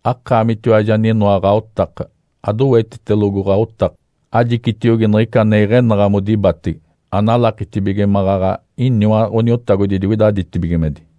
Akaamitiwaji aninoa ɡ̶aotaka, adowetitelogo ɡ̶aotaka, ajicitiogi niɡ̶ica ane iɡ̶enaɡ̶a modibatege. Analakitibige maɡ̶aɡ̶a iniwa Ǥaniotagodi digoida ditibigimedi.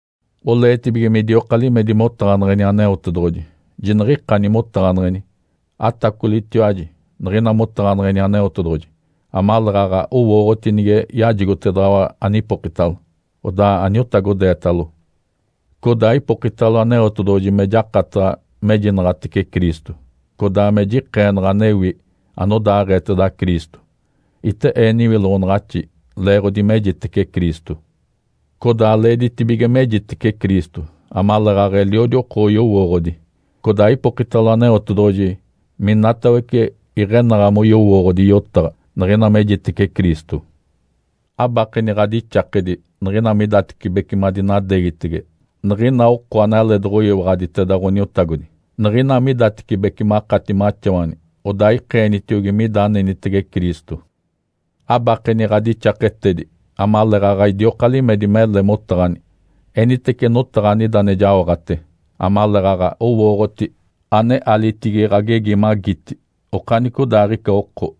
Oleetibige midioka limedi motaɡ̶aneɡ̶eni Aneotedoɡ̶oji, jiniɡ̶ikani motaɡ̶aneɡ̶eni. Atacolitiwaji niɡ̶ina motaɡ̶aneɡ̶eni Aneotedoɡ̶oji amaleeɡ̶aɡ̶a owooɡ̶oti nige yajigotedaɡ̶awa anipokitalo, odaa aniotagodeetalo. Codaa ipokitalo Aneotedoɡ̶oji me jakataɡ̶a mejinaɡ̶atece Cristo, codaa me jikeenaɡ̶a anewi anodaaɡ̶eeteda Cristo. Ite ee niwiloɡ̶onaɡ̶axi leeɡ̶odi mejitece Cristo. Codaa leeditibige mejitece Cristo amaleeɡ̶aɡ̶a eliodi oko oyowooɡ̶odi. Codaa ipokitalo Aneotedoɡ̶oji minatawece iɡ̶enaɡ̶a moyowooɡ̶odi yotaɡ̶a niɡ̶ina mejitece Cristo. Abakeni ɡ̶adixakedi niɡ̶ina midatecibece madinadeegitege niɡ̶ina oko analeedoɡ̶oyiwaɡ̶aditeda Ǥoniotagodi. Niɡ̶ina midatecibece makati maxawani, odaa ikeenitiogi mida anenitege Cristo. Abakeni ɡ̶adixaketedi amaleeɡ̶aɡ̶a idioka limedi mele motaɡ̶ani, enitece notaɡ̶a anida ane jaoɡ̶ate, amaleeɡ̶aɡ̶a owooɡ̶oti ane alitigi ɡ̶agegi magiti okanicodaaɡ̶ica oko.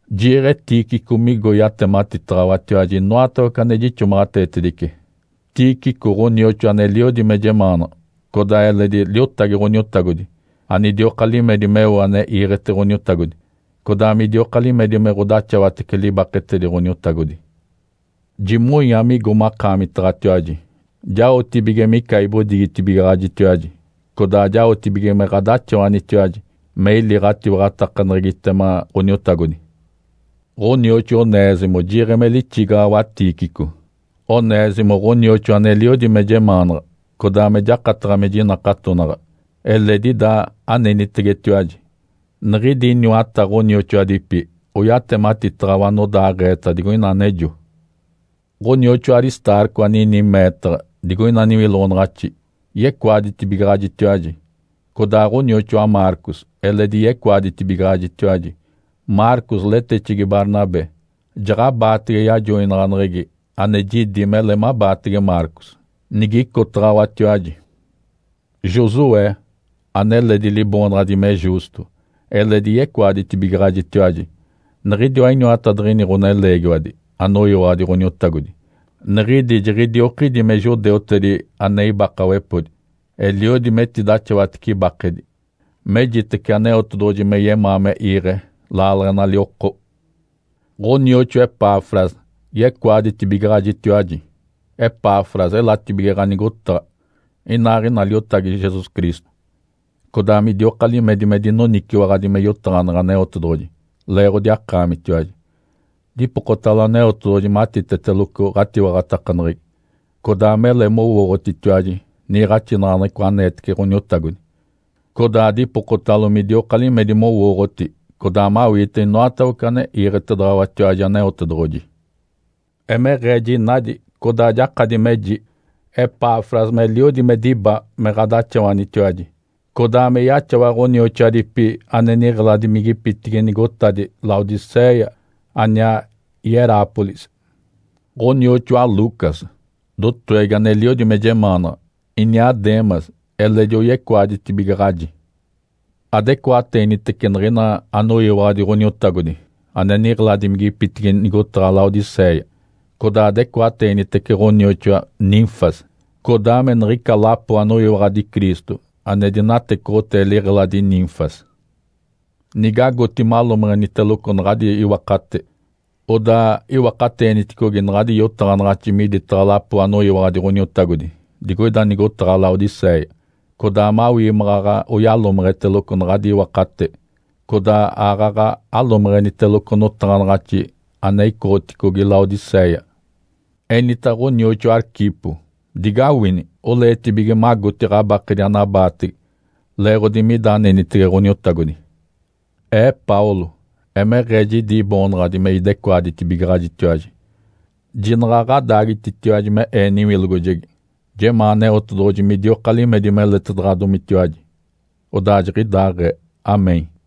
Jiiɡ̶e Tíquico migo yatematitaɡ̶awatiwaji inoatawece ane jixomaɡ̶ateetedice. Tíquico ɡ̶onioxoa aneliodi me jemaanaɡ̶a, codaa eledi liotagi Ǥoniotagodi anidioka limedi meo ane iiɡ̶ete Ǥoniotagodi, codaa midioka limedi me ɡ̶odaxawatece libaketedi Ǥoniotagodi. Jimonya migo makaamitaɡ̶atiwaji, jaotibige mica ibodigitibigaɡ̶ajitiwaji, codaa jaotibige me ɡ̶adaxawanitiwaji me ili ɡ̶atiwaɡ̶atakaneɡ̶egitema Ǥoniotagodi. Ǥonioxoa Onésimo jiiɡ̶e me lixigaɡ̶awa Tíquico. Onésimo ɡ̶onioxoa aneliodi me jemaanaɡ̶a, codaa me jakataɡ̶a me jinakatonaɡ̶a. Eledi ida anenitegetiwaji. Niɡ̶idi iniwata ɡ̶onioxoadipi oyatematitaɡ̶awa anodaaɡ̶eeta digoina anejo. Ǥonioxoa Aristarco anini meetaɡ̶a digoina niwiloɡ̶onaɡ̶axi, yecoaditibigaɡ̶ajitiwaji, codaa ɡ̶onioxoa Marcos eledi yecoaditibigaɡ̶ajitiwaji. Marcos letexegi Barnabé. Jaɡ̶abaatege yajoinaɡ̶aneɡ̶egi ane jidi mele mabaatege Marcos, nigicotaɡ̶awatiwaji. Josué, aneledi liboonaɡ̶adi me Justo, eledi yecoaditibigaɡ̶ajitiwaji. Niɡ̶idiwa iniwatadiɡ̶ini ɡ̶oneleegiwadi anoyiwaɡ̶adi Ǥoniotagodi, niɡ̶idi jiɡ̶idiokidi me judeutedi ane ibakawepodi. Eliodi metidaxawatece ibakedi, mejitece Aneotedoɡ̶oji me yemaa me iiɡ̶e laaleɡ̶enali oko. Ǥonioxoa Epafras yecoaditibigaɡ̶ajitiwaji. Epafros elatibige ɡ̶anigotaɡ̶a, inaaɡ̶ina liotagi Jesus Cristo, codaa midioka limedi me dinoniciwaɡ̶adi me yotaɡ̶aneɡ̶e Aneotedoɡ̶oji leeɡ̶odi akaamitiwaji. Dipokotalo Aneotedoɡ̶oji matiteteloco ɡ̶atiwaɡ̶atakaneɡ̶egi, codaa mele mowooɡ̶otitiwaji niiɡ̶axinaɡ̶aneɡ̶eco aneetece Ǥoniotagodi, codaa dipokotalo midioka limedi mowooɡ̶oti codaa mawiite inoatawece ane iiɡ̶etedaɡ̶awatiwaji Aneotedoɡ̶oji. Emeɡ̶ee jinadi codaa jakadi meji Epafras meliodi me diba me ɡ̶adaxawanitiwaji, codaa me yaxawa ɡ̶onioxoadipi ane niɡ̶eladimigipitigi nigotadi Laodicéia aniaa Hierápolis. Ǥonioxoa Lucas, dotowegi aneliodi me jemaanaɡ̶a, iniaa Demas eledi oyecoaditibigaɡ̶aji. Adecoateenitece niɡ̶ina anoyiwaɡ̶adi Ǥoniotagodi ane niɡ̶eladimigipitigi nigotaɡ̶a Laodicéia, codaa adecoateenitece ɡ̶onioxoa Nínfas, codaa me niɡ̶ica lapo anoyiwaɡ̶adi Cristo ane dinatecoɡ̶otee liɡ̶eladi Nínfas. Nigagoti malomeɡ̶eniteloco naɡ̶adi iwakate, odaa iwakateeniticogi naɡ̶adi yotaɡ̶anaɡ̶axi miditaɡ̶a lapo anoyiwaɡ̶adi Ǥoniotagodi digoida nigotaɡ̶a Laodicéia, codaa mawii maɡ̶aɡ̶a oyalomeɡ̶eteloco naɡ̶adi iwakate. Codaa aaɡ̶aɡ̶a alomeɡ̶eniteloco notaɡ̶anaɡ̶axi ane icoɡ̶otigi Laodicéia. Enita ɡ̶onioxoa Arquipo, “Digawini! Oleetibige magoti ɡ̶abakedi anabaatege, leeɡ̶odi mida anenitege Ǥoniotagodi!” Ee Paulo, emeɡ̶ee jidi iboonaɡ̶adi me idecoaditibigaɡ̶ajitiwaji. Jinaɡ̶a ɡ̶adaagititiwaji me ee niwilogojegi. Jemaa Aneotedoɡ̶oji midioka limedi meletedaɡ̶adomitiwaji. Odaa jiɡ̶idaaɡ̶ee. (Amém).